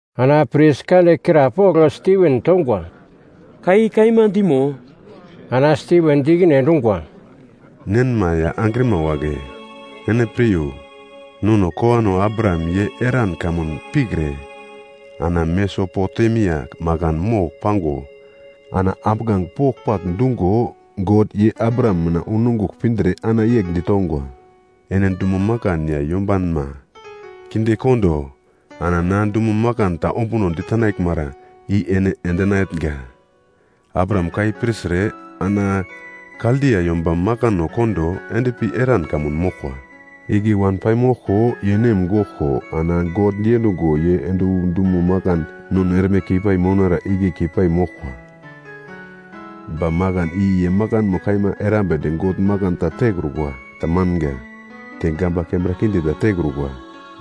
Ana pris kande krapogl Stiven tongwa, “Ka i kaima dimo?” Ana Stiven di ikine endungwa, “Nenma ya angrima wagle! Ene piryo! Nono kowano Abraham ye Haran kamun pikre ana Mesopotemia makan mogl pango ana ambuglange pogl-pagl dungo God, ye Abraham mina unongugl pindre ana yegl ditongwa, ‘Ene dumo makan ya yombanma kindekondo ana na dumo makan ta ombuno ditenaglmara i ene endinatnga.’ “Abraham ka i pirtre ana Kaldia yomba makano kondo endpi Haran kamun moglkwa. Igle wan paimoglko ye nem goglko, ana God diendungo ye ende wu dumo makan nono erme keipai mounara igle keipai moglkwa. Ba makan i ye makanmo kaima erambedi God makan ta tekrukwa, ta manga, te gamba kembra kinde ta tekrukwa.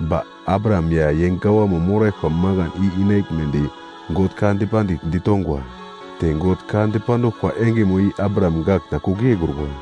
Ba Abraham ya ye gawamo moraglkwa makan i inaglmedi God ka dipandigl ditongwa. Te God ka dipanduglkwa engemo i Abraham gak ta kugl yeikrukwa.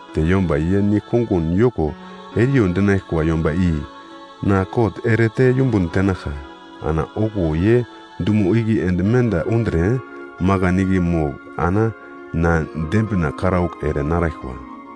Te yomba ye nigl-kongun yoko eriyo dinaglkwa yomba i na kot erete yumbun tenaglka. Ana okuwo ye dumo igle ende menda undre, makan igle mogl ana na dembina karaugl ere naraglkwa.’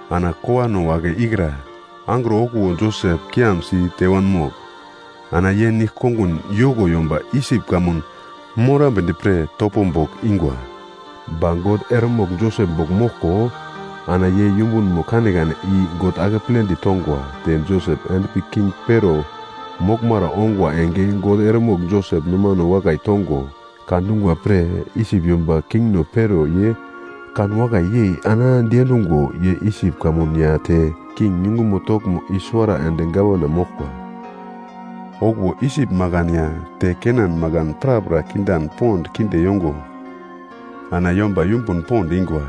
“Ana kowano wagle ikra angro okuwo Josep kiam site wanmogl, ana ye nigl-kongun yoko yomba Isip kamun morambedi pre topo bogl ingwa. Ba God eremogl Josep bogl moglko, ana ye yumbunmo kanekane i God akepledi tongwa te Josep endpi king Pero moglmara ongwa enge God eremogl Josep nomane wakai tongo ka dungwa pre Isip yomba kingno Pero ye kanwakai yei ana diendungo ye Isip kamun ya te king yungumo toglmo i-suwara ende gavana moglkwa. “Okuwo Isip makan ya te Kena makan prapra kindan pond kinde yongo, ana yomba yumbun pond ingwa,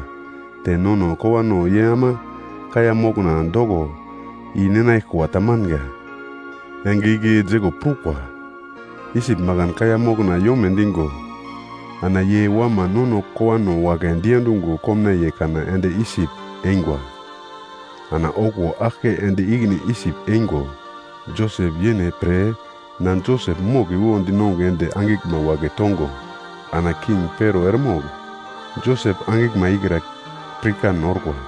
te nono kowano ye ama kaiya mokna doko i-ninaglkwa tamanga. Enge igle Jekop prukwa. Isip makan kaiya mokna yome dingo ana ye wama nono kowano wagle diendungo komnaiye kana ende Isip eingwa. Ana okuwo aglke ende ikine Isip eingo, Josep yene pre na Josep mogliwo dinongugl ende angiglma wagle tongo ana king Pero eremogl Josep angiglma ikra pirkan orkwa.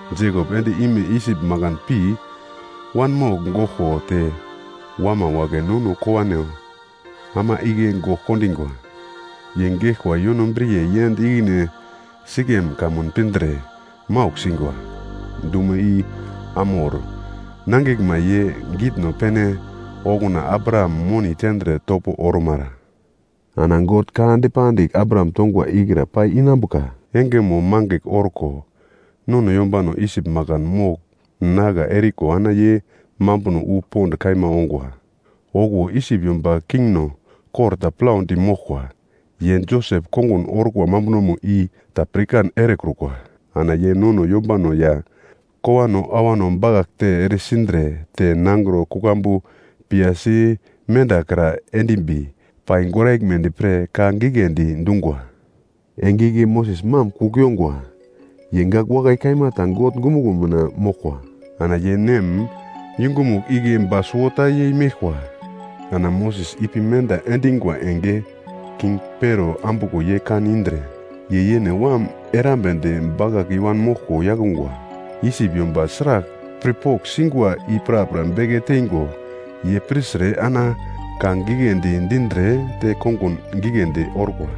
Jekop ende ime Isip makan pi wanmogl goglko te wama wagle nono kowano ama igle gogl kondingwa. Ye geglkwa yonobriye yend ikine Sikem kamun pindre maugl singwa. Dumo i Hamor nangiglma ye gitno pene, okuna Abraham moni tendre topo ormara. “Ana God ka dipandigl Abraham tongwa ikra pai inambuka engemo mangigl orko nono yombano Isip makan mogl nagla eriko ana ye nambano wu pond kaima ongwa. Okuwo Isip yomba kingno kor ta plaudi moglkwa, ye Josep kongun orkwa mambunomo i ta pirkan erekrukwa. Ana ye nono yombano ya kowano awano bakaglte eresindre te nangro kuglambu piyasi mendakra endimbi pai goraglmedi pre ka giglendi dungwa. “Enge igle Moses mam kugl yongwa, ye gak wakai kaima ta God ongumuglo mina moglkwa. Ana ye nem yungumugl igle ba suwota yei meglkwa. Ana Moses ipi menda endingwa enge king Pero ambuglo ye kan indre ye yene wam erambedi bakagl i-wan moglko yakungwa. Isip yomba sragl pirpogl singwa i prapra beke teingo ye pirtre ana ka giglendi dindre te kongun giglendi orkwa.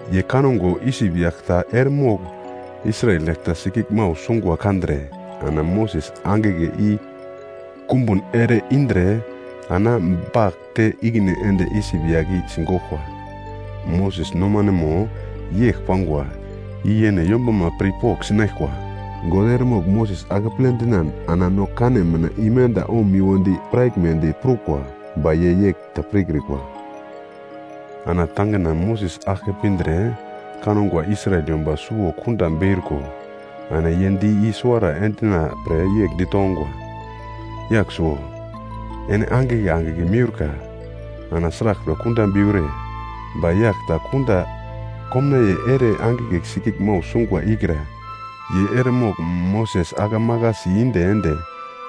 Ye kango Isip yagl ta eremogl Israel yagl ta sikiglmau sungwa kandre, ana Moses angigle i kumbun ere-indre ana bagl te ikine ende Isip yagl i sigoglkwa. Moses nomanemo yegl pangwa i yene yombama pirpogl sinaglkwa, God eremogl Moses akeple dinan ana no kane mina imenda omiwodi piraglmedi prukwa, ba ye yegl ta pirkrikwa. Ana tangina Moses aglke pindre kangwa Israel yomba suwo kunda beurko ana ye di i-suwara endina-pre yegl ditongwa, ‘Yagl suwo, ene angigle angigle miurka ana sraglpre kunda beure?’ “Ba yagl ta kunda komnaiye ere angigle sikiglmau sungwa ikra ye eremogl Moses ake maglasi inde ende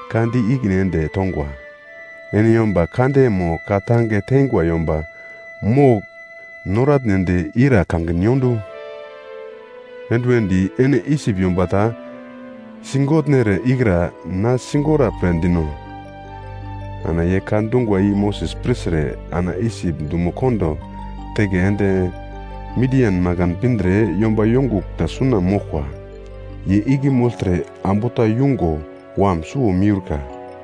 ka di ikine ende tongwa, ‘Ene yomba kande mo ka tange teingwa yomba mogl noratnedi ira kangin yondu? Enduwendi ene Isip yomba ta sigotnere ikra na sigora pre dino?’ Ana ye ka dungwa i Moses pirtre ana Isip dumo kondo teke ende Midian makan pindre yomba yongugl ta suna moglkwa. Ye igle mogltre ambu ta yungo wam suwo miurka.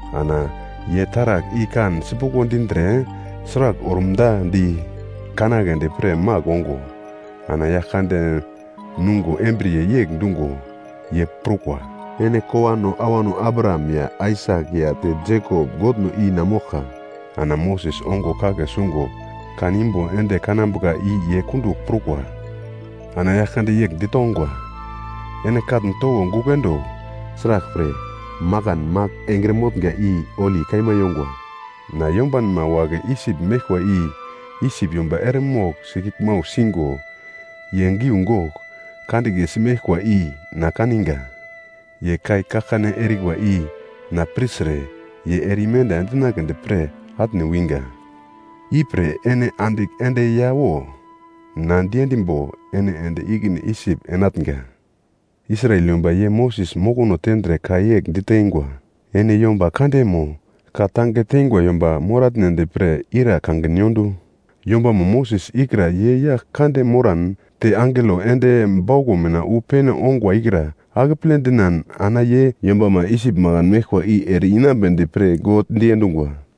Ana ye taragl i kan sipuglo dindre sragl orumda di kanagledi pre magl ongo, ana Yaglkande nungo embriye yegl dungo ye prukwa, ‘Ene kowano awano Abraham ya Aisak ya te Jekop Godno i na moglka.’ Ana Moses ongo kagle sungo kan imbo ende kanambuka i ye kundugl prukwa. “Ana Yaglkande yegl ditongwa, ‘Ene katn towo gugl endo, sraglpre, makan magl engre motnga i holi kaima yongwa. Na yombanma wagle Isip meglkwa i Isip yomba eremogl sikiglmau singo ye giugogl kandiglesi meglkwa i na kaninga. Ye kai kaglkane erikwa i na pirtre ye ere imenda endinagledi pre atne winga. Ipre ene andigl ende ya wo; na diendimbo ene ende ikine Isip enatnga.’ “Israel yomba ye Moses mokono tendre ka yegl diteingwa, ‘Ene yomba kande mo ka tange teingwa yomba moratnedi pre ira kangin yondu?’ Yombamo Moses ikra ye yagl kande moran te angelo ende bauglo mina wu pene ongwa ikra akeple dinan ana ye yombama Isip makan meglkwa i ere-inambedi pre God diendungwa.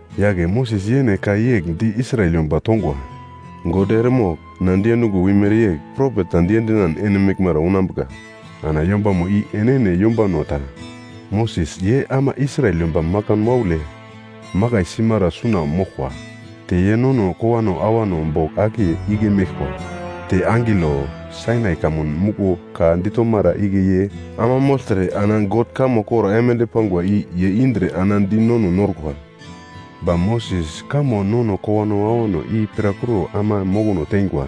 “Yagle Moses yene ka yegl di Israel yomba tongwa, ‘God eremogl na diendungo wimere yegl propet ta diendinan ene meglmara unambuka. Ana yombamo i enene yombano ta.’ Moses ye ama Israel yomba makan waule makai simara suna moglkwa. Te ye nono kowano awano bogl akiye igle meglkwa. Te angelo, Sainai kamun muglo ka ditomara igle ye ama mogltre ana God kamo kor aimande pangwa i ye indre ana di nono norkwa. “Ba Moses kamo nono kowano awano i pirakuro ana mokono teingwa.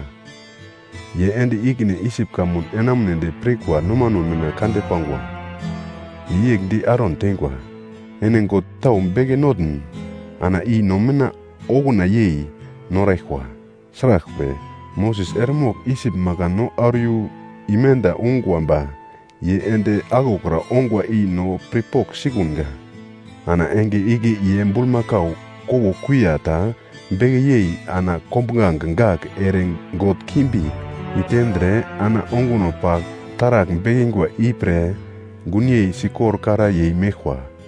Ye ende ikine Isip kamun enamunedi pirkwa nomano mina kande pangwa. Ye yegl di Aron teingwa, ‘Ene god tau beke notn ana i no mina okuna yei noraglkwa. Sraglpre, Moses eremogl Isip makan no auro imenda ungwa ba ye ende aglokra ongwa i no pirpogl sikunga.’ Ana enge igle ye bulmakau kowo kuiya ta beke yei ana kombuglange gagl ere god kimbi i tendre ana onguno pagl taragl bekingwa ipre gunyei sikorkara yei meglkwa.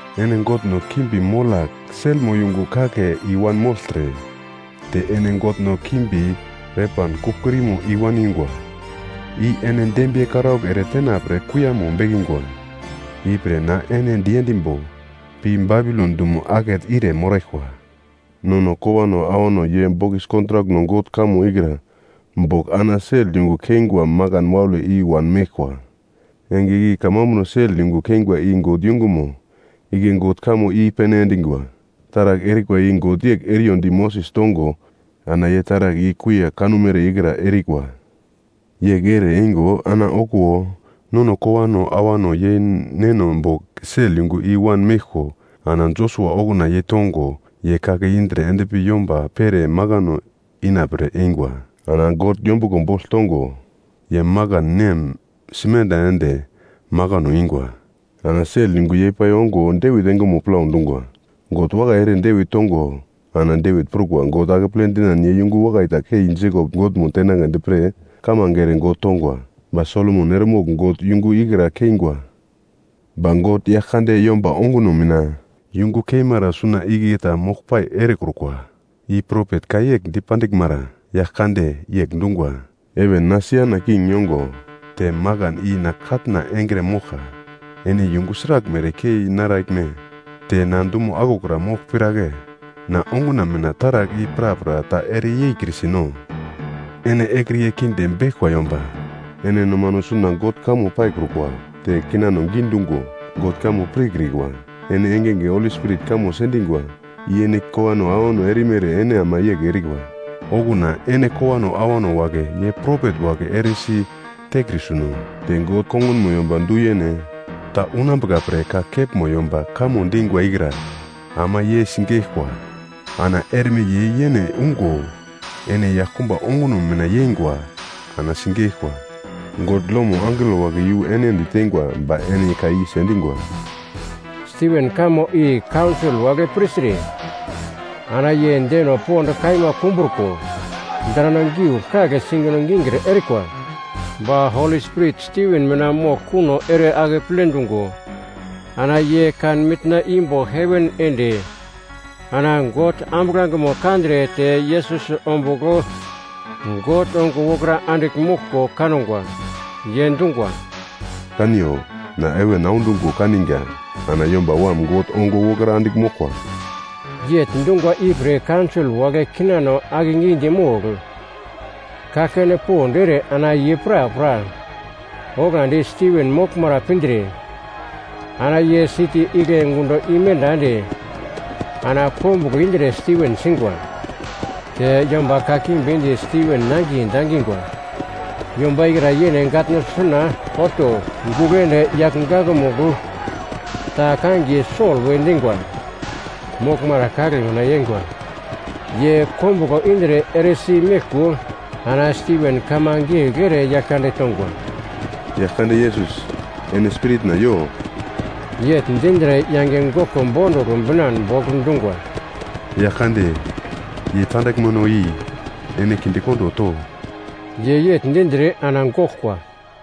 Ene godno kimbi Molak selmo yungu kake i-wanmogltre, te ene godno kimbi Repan kugl-kurimo i-waningwa. I ene dembiye karaugl ere tena pre kuiyamo bekingwa. Ipre na ene diendimbo pi Babilon dumo akete ire moraglkwa.’ “Nono kowano awano ye bokis kontrak God kamo ikra bogl ana sel yungu keingwa makan waule i-wan meglkwa, enge igle kamambuno sel yungu keingwa i God yungumo, igle God kamo i-pene endingwa. Taragl erikwa i God yegl eriyo di Moses tongo ana ye taragl i kuiya kanumere ikra erikwa. Yegl ere eingo ana okuwo, nono kowano awano ye neno bogl sel yungu i-wan meglko ana Josua okuna yeitongo ye kake indre endpi yomba pere makano inapre eingwa. Ana God yombuglo bogl tongo, ye makan nem simenda ende makano ingwa. Ana sel yungu yei-pai ongo Devit engemo plau dungwa. God wakai ere Devit tongo ana Devit prukwa God akeple dinan ye yungu wakai ta kei Jekop Godmo tenagledi pre kamange ere God tongwa. Ba Solomon eremogl God yungu ikra keingwa. “Ba God Yaglkande yomba onguno mina yungu keimara suna igle ta moglpai erekrukwa. I propet ka yegl dipandiglmara: ‘Yaglkande yegl dungwa, “‘Heven na siana king yongo, te makan i na katna engre moglka. Ene yungu sraglmere kei naraglme? Te na dumo aglokra mogl piragle? Na onguna mina taragl i prapra ta ere yeikrisi-no?’ “Ene ekriye kinde beglkwa yomba! Ene nomano suna God kamo paikrukwa, te kinano gidungo God kamo pirkrikwa! Ene engenge Holi Spirit kamo sendingwa. I ene kowano awano erimere ene ama yegl erikwa. Okuna ene kowano awano wagle ye propet wagle eresi tekrisiuno? Te God kongunmo yomba du-yene ta unambuka pre ka kepmo yomba kamo dingwa ikra ama ye sigeglkwa. Ana erme ye yene ungo ene yaglkumba onguno mina yeingwa ana sigeglkwa. God lomo angelo wagle iyu ene ditengwa ba ene ka i sendingwa.” Stiven kamo i kaunsol wagle pirtre ana ye deno pond kaima kumbruko, drano giugl kagl singino gikir erikwa. Ba Holi Spirit Stiven mina moglkuno ere akeple dungo ana ye kan mitna imbo heven ende ana God ambuglangemo kandre te Yesus ombugl God ongo wokra andigl moglko kangwa. Ye dungwa, “Kaniyo. Na heven audungo kaninga ana Yomba Wam God ongo wokra andigl moglkwa!” Yegl dungwa ipre kaunsol wagle kinano akegidi mogl kaglkane pond ere ana ye prapra oglagldi Stiven moglmara pindre, ana ye siti igle gundo imenda ende ana kombuglo indre Stiven singwa. Te yomba kakimbi di Stiven nangiye dangingwa yomba ikra yene gatno suna olto gugl ende yagl gakmugl ta kangiye Sol we dingwa moglmara kagle mina yeingwa. Ye kombuglo indre eresi meglko ana Stiven kamange yegl ere Yaglkande tongwa, “Yaglkande Yesus, ene spiritna yo!” Yegl dindre yange goglko bondugl binan bogl dungwa, “Yaglkande, ye tandaglmeno i ene kindekondo to.” Ye yegl dindre ana goglkwa.